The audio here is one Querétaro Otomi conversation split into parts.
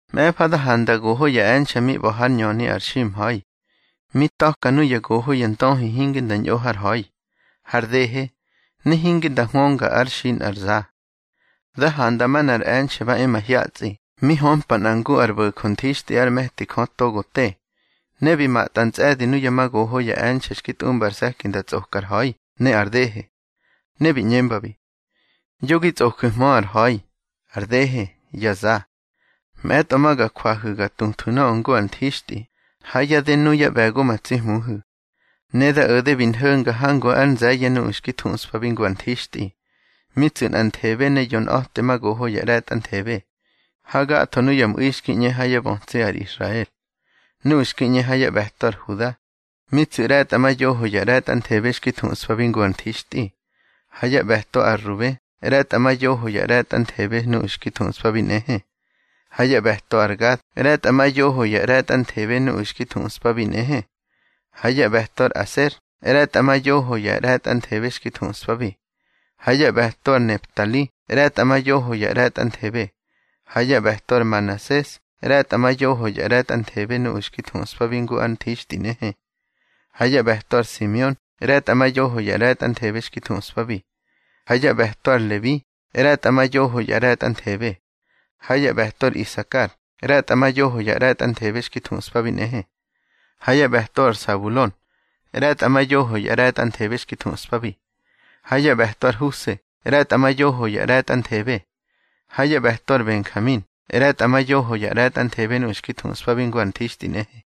Mꞌe̱fa da handa goho ya e̱nxe̱ mi ꞌba̱ ha yá ñöni ar ximha̱i. Mi ta̱ka nuya goho ya ndöhi hinge nda ñꞌo har ha̱i, har dehe, ne hinge nda huönga ár xi nꞌar za. Da handa manꞌar e̱nxe̱ ba e mahyatsꞌi mi hömpa nꞌa ngu ar bo̱jö nthixtꞌi ár me̱ti Jö togo te. Ne bi matꞌa ntsꞌe̱di nuya ma goho ya e̱nxe̱ xki tꞌumba ar se̱ki nda tsꞌoka ar ha̱i ne ar dehe. Ne bi ꞌñembabi: —Yo gi tsꞌoju̱hmö ar ha̱i, ar dehe, ya za. Mꞌe̱tꞌo ma ga jwahu̱ ga tuthwu̱ nöꞌö ngu ar nthixtꞌi ha yá dë nuyá ꞌbe̱go ma tsi Hmuhu̱. Ne da o̱de bi nho̱nga hangu ár nze̱ye̱ nuꞌu̱ xki thuꞌspabi ngu ar nthixtꞌi: mi tsu̱ nꞌanthebe ne yonꞌa̱temagoho ya ꞌre̱tꞌanthebe, ha gatho nuya mꞌu̱i xki ꞌñe ha yá bötsi ar Israel. Nuꞌu̱ xki ꞌñe ha yá ꞌbe̱to ar Huda, mi tsu̱ ꞌre̱tꞌamayoho ya ꞌre̱tꞌanthebe xki thuꞌspabi ngu ar nthixtꞌi, ha yá ꞌbe̱to ar Rube ꞌre̱tꞌamayoho ya ꞌre̱tꞌanthebe nuꞌu̱ xki thuꞌspabi nꞌehe, ha yá ꞌbe̱to ar Gad ꞌre̱tꞌamayoho ya ꞌre̱tꞌanthebe nuꞌu̱ xki thuꞌspabi nꞌehe. Ha yá ꞌbe̱to ar Aser ꞌre̱tꞌamayoho ya ꞌre̱tꞌanthebe xki thuꞌspabi, ha yá ꞌbe̱to ar Neftali ꞌre̱tꞌamayoho ya ꞌre̱tꞌanthebe, ha yá ꞌbe̱to ar Manases ꞌre̱tꞌamayoho ya ꞌre̱tꞌanthebe nuꞌu̱ xki thuꞌspabi ngu ar nthixtꞌi nꞌehe. Ha yá ꞌbe̱to ar Simeon ꞌre̱tꞌamayoho ya ꞌre̱tꞌanthebe xki thuꞌspabi, ha yá ꞌbe̱to ar Lebi ꞌre̱tꞌamayoho ya ꞌre̱tꞌanthebe, ha yá ꞌbe̱to ar Isakar ꞌre̱tꞌamayoho ya ꞌre̱tꞌanthebe xki thuꞌspabi nꞌehe. Ha yá ꞌbe̱to ar Sabulon ꞌre̱tꞌamayoho ya ꞌre̱tꞌanthebe xki thuꞌspabi, ha yá ꞌbe̱to ar Huse ꞌre̱tꞌamayoho ya ꞌre̱tꞌanthebe, ha yá ꞌbe̱to ar Benjamin ꞌre̱tꞌamayoho ya ꞌre̱tꞌanthebe nuꞌu̱ xki thuꞌspabi ngu ar nthixtꞌi nꞌehe.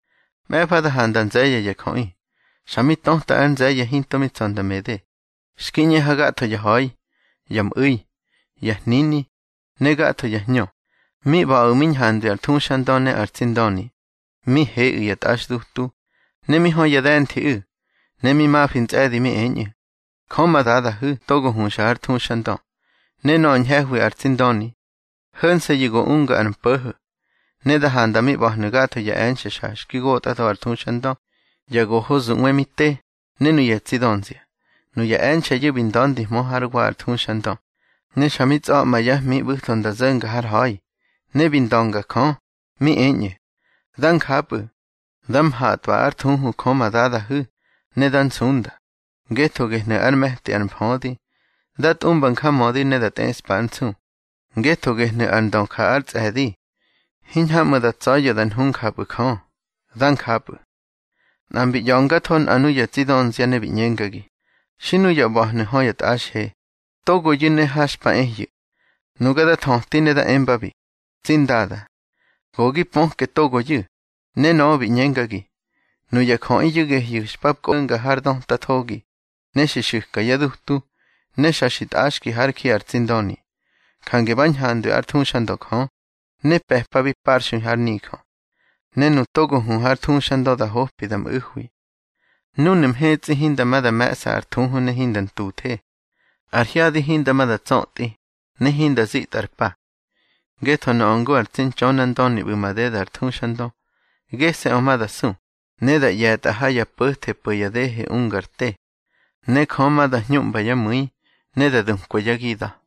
Mꞌe̱fa da handa nze̱ye̱ ya jöꞌi, xa mi töta ar nze̱ye̱ hinto mi tsa̱ nda mede, xki ꞌñe ha gatho ya ha̱i, ya mꞌu̱i, ya hnini, ne gatho ya hñö. Mi ꞌba̱ꞌu̱ mi ñhandwi ar thuxandö ne ar tsi Ndöni, mi heꞌu̱ ya tꞌaxdutu, ne mi hö ya de̱nthiꞌu̱. Ne mi mafi ntsꞌe̱di mi eñꞌu̱: Jö ma Dadahu̱ togo huxa har thuxandö, ne nöꞌö ñhe̱hwi ar tsi Ndöni, ho̱nse̱yu̱ go unga ar mpo̱ho̱. Ne da handa mi ꞌba̱hnu̱ gatho ya e̱nxe̱ xa xki gotꞌatho ar thuxandö, ya goho zuꞌwe mi te, ne nuya tsi dönzia. Nuya e̱nxe̱yu̱ bi nda̱ndihmö hár wa ar thuxandö, ne xa mi tsꞌa̱ꞌma yá hmi ꞌbu̱tho nda zo̱nga har ha̱i, ne bi ndönga Jö. Mi eñꞌu̱: Dá njapꞌu̱. Dá mhatꞌwa ár thuhu Jö ma Dadahu̱, ne dá nsunda, ngetho gehnu̱ ár me̱ti ar mfödi. Dá tꞌumba njamödi ne dá tꞌeꞌspa ár nsu, ngetho gehnu̱ ar ndö ja ár tsꞌe̱di. Hiñhamꞌu̱ da tsa̱ya̱ da nhu njapꞌu̱ Jö. Dá njapꞌu̱. Nꞌa mbi ꞌya̱ngatho nꞌa nuya tsi dönzia, ne bi ꞌñengagi: —Xi nuya ꞌba̱hnu̱ hö ya tꞌaxhe, togoyu̱ ne ha xpa ehyu̱. Nuga da thöti ne da embabi: —Tsi ndada, go gi pöke togoyu̱. Ne nöꞌö bi ꞌñengagi: —Nuya jöꞌiyu̱ gehyu̱ xpa kꞌonga har döta thogi, ne xi xu̱ka yá dutu, ne xa xi tꞌaxki hár ji ar tsi Ndöni. Jange ꞌba̱ ñhandwi ár thuxandö Jö, ne pe̱pabi parxui hár nijö. Ne nu togo hu har thuxandö da hopi da mꞌu̱hwi. Núnu̱ mhetsꞌi hinda ma da me̱ꞌsa ar thuhu ne hinda ntuthe. Ar hyadi hinda ma da tsötꞌi, ne hinda zitꞌa ar pa. Ngetho nöꞌö ngu ar tsi Ntxönandöni ꞌbu̱ madeda ar thuxandö, gese̱ꞌö ma da su, ne da ꞌye̱tꞌa ha ya po̱the po̱ ya dehe unga ar te. Ne Jö ma da hñuꞌmba yá mu̱i, ne da dukwa yá gida̱.